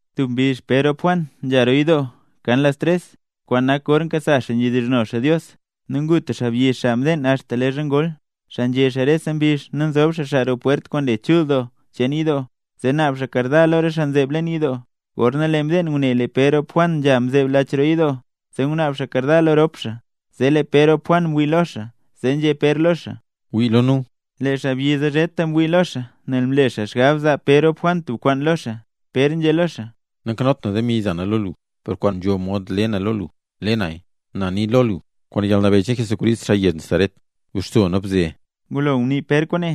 Tub mbizh Pér rop Juan nzha roo yidoo, kan las tres, kwaan nak gor nkasa xaa nzhedizhno xaa Dios. Nu ngu tub xaabyi, xaa mdeen axta leezha ngol, xaa nzhe xaa rese mbizh nu nzob xaa xaa roo pwert kwaan le Chul Doo cheen yidoo, zee naab xaa karda lo re xaa nzeeb leen lach roo yidoo. Gorna lee xaa mdeen ngune lee Pér rop Juan nzha nzeeb lach roo yidoo, zee ngunaab xaa karda lo rop xaa. Zee lee Pér rop Juan mwii lo xaa, zee nzhé Pér lo xaa: —Wii lo nu. Lee xaabyi zee zheta mwii lo xaa nel mle xaa xgab zaa Pér rop Juan tub kwaan lo xaa. Pér nzhé lo xaa: —Nankanot na demi za na lo lu, per kwaan nzho mod le na lo lu, le naya. Na nii lo lu: “Kwaan yalnabeyy cheen Jesucrist xaa yezh Nazaret, guxso nu bze”. Ngulo ngunii Pér kwaane,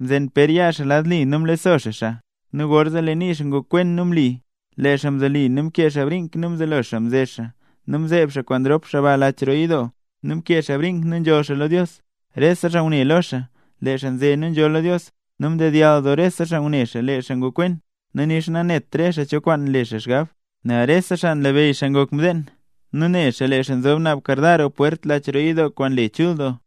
mzen Pér yaa xaa lad li nu mlexso xaa xaa, nu gorzee lee nii xaa ngokwen nu mli. Lee xaa mzoli nu mkee xaa brink nu mzelo xaa mze xaa, zee mzeeb xaa kwaan rop xaa ba lach roo yidoo. Nu mkee xaa brink nu nzholl xaa lo Dios. Rese xaa ngune lo xaa lee xaa nze nu nzholl xaa lo Dios, nu mdedyall doo rese xaa ngune lee xaa ne ngokwen, nu nixa nanet rese xaa cho kwaan le xaa xgab. Nel rese xaa nlabeyy xaa ngok mdeen, nu ne xaa lee xaa nzob naab karda roo pwert lach roo yidoo kwaan le Chul Doo.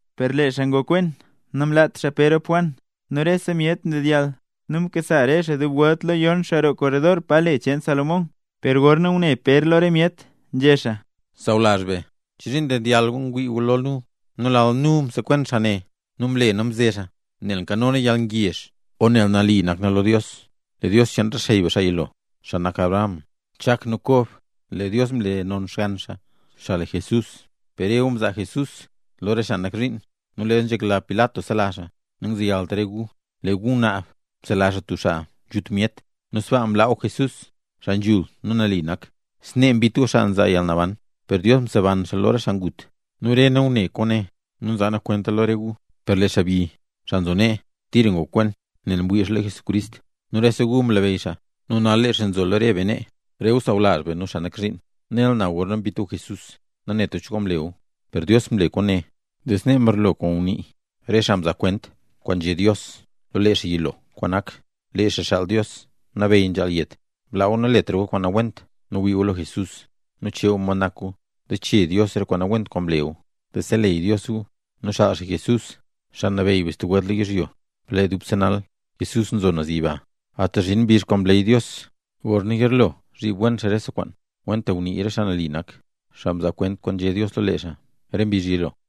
Per lee xaa ngokwen namlaat xaa Pér rop Juan. Nu rese myet ndedyall nu mkasa re xaa dub welt lo yon xaa roo korredor pa le cheen Salomón. Per gorna ngune Pér lo re myet, nzhé xaa: —Sawlazh be, ¿chozhiin ndedyall gu ngwii gu lo nu, nu lal nu msekwen xaa ne nu mle nu mze xaa, nel nkano nu yalngezh o nel nali nak nu lo Dios? Lee Dios cheen re xey be xaa yilo, xaa nak Abraham, Chak nu Kob, lee Dios mle non Xgann Xaa, xaa le Jesús. Per re gu mzaa Jesús lo re xaa nak zhiin; nu leezha nzhekla Pilat sela xaa, nangzeyalt re gu. Lee gu ngunaab msela xaa tub xaa nzhut myet, nu sbaa mlaa gu Jesús, xaa nzhul nu nali nak. Snee mbit gu xaa nzaa yalnaban. Per Dios mseban xaa lo re xaa ngut. Nu re nu ngune kwaane, nu nzaa nu kwenta lo re gu. Per lee xaabyi, xaa nzo nee, tira ngokwen nel ngwii xaa lo Jesucrist. Nu rese gu nlabeyy xaa. Nu nal lee xaa nzo lo re be nee. ’Re gu sawlazh be nu re xaa nak zhiin, nela na gorna mbit gu Jesús, nanet gu cho kwaan mle gu. Per Dios mle kwaane, zee snee mbarlo kwaan ngunii re xaa mzaa kwent kwaan nzhé Dios lo lee xaa yilo, kwaan nak: lee Xaa Xaal Dios Nabeyy nzhaal yet. Blaa gu naletra gu kwaan nawent nu wii gu lo Jesús, nu chee gu mod nak gu, zee chee Dios rese kwaan nawent kwaan mle gu, zee seleyy Dios gu. Nu xaal xaa Jesús, Xaa Nabeyy be stub welt lo yizhyo ne. Per lee dubse nal Jesús nzo naz yiba, axta zhin mbizh kwaan mleey Dios gorna yilo zhib wen xaa rese kwaan, kwentaxa ngunii re xaa mzo nambey, xaa mzaa kwent kwaan nzhé Dios lo lee xaa re mbizh yilo.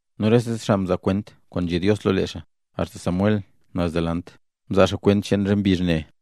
’Nu rese xaa mzaa kwent kwaan nzhé Dios lo lee xaa, axta Samuel naz delant, mzaa xaa kwent cheen re mbizh ne.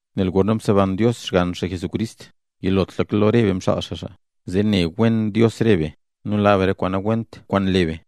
Nel gorna mseban Dios Xgann xaa Jesucrist, yilotlaka lo re be mxaal xaa xaa, zee ne wen Dios re be, nu laa be re kwaan nawent kwaan nle be.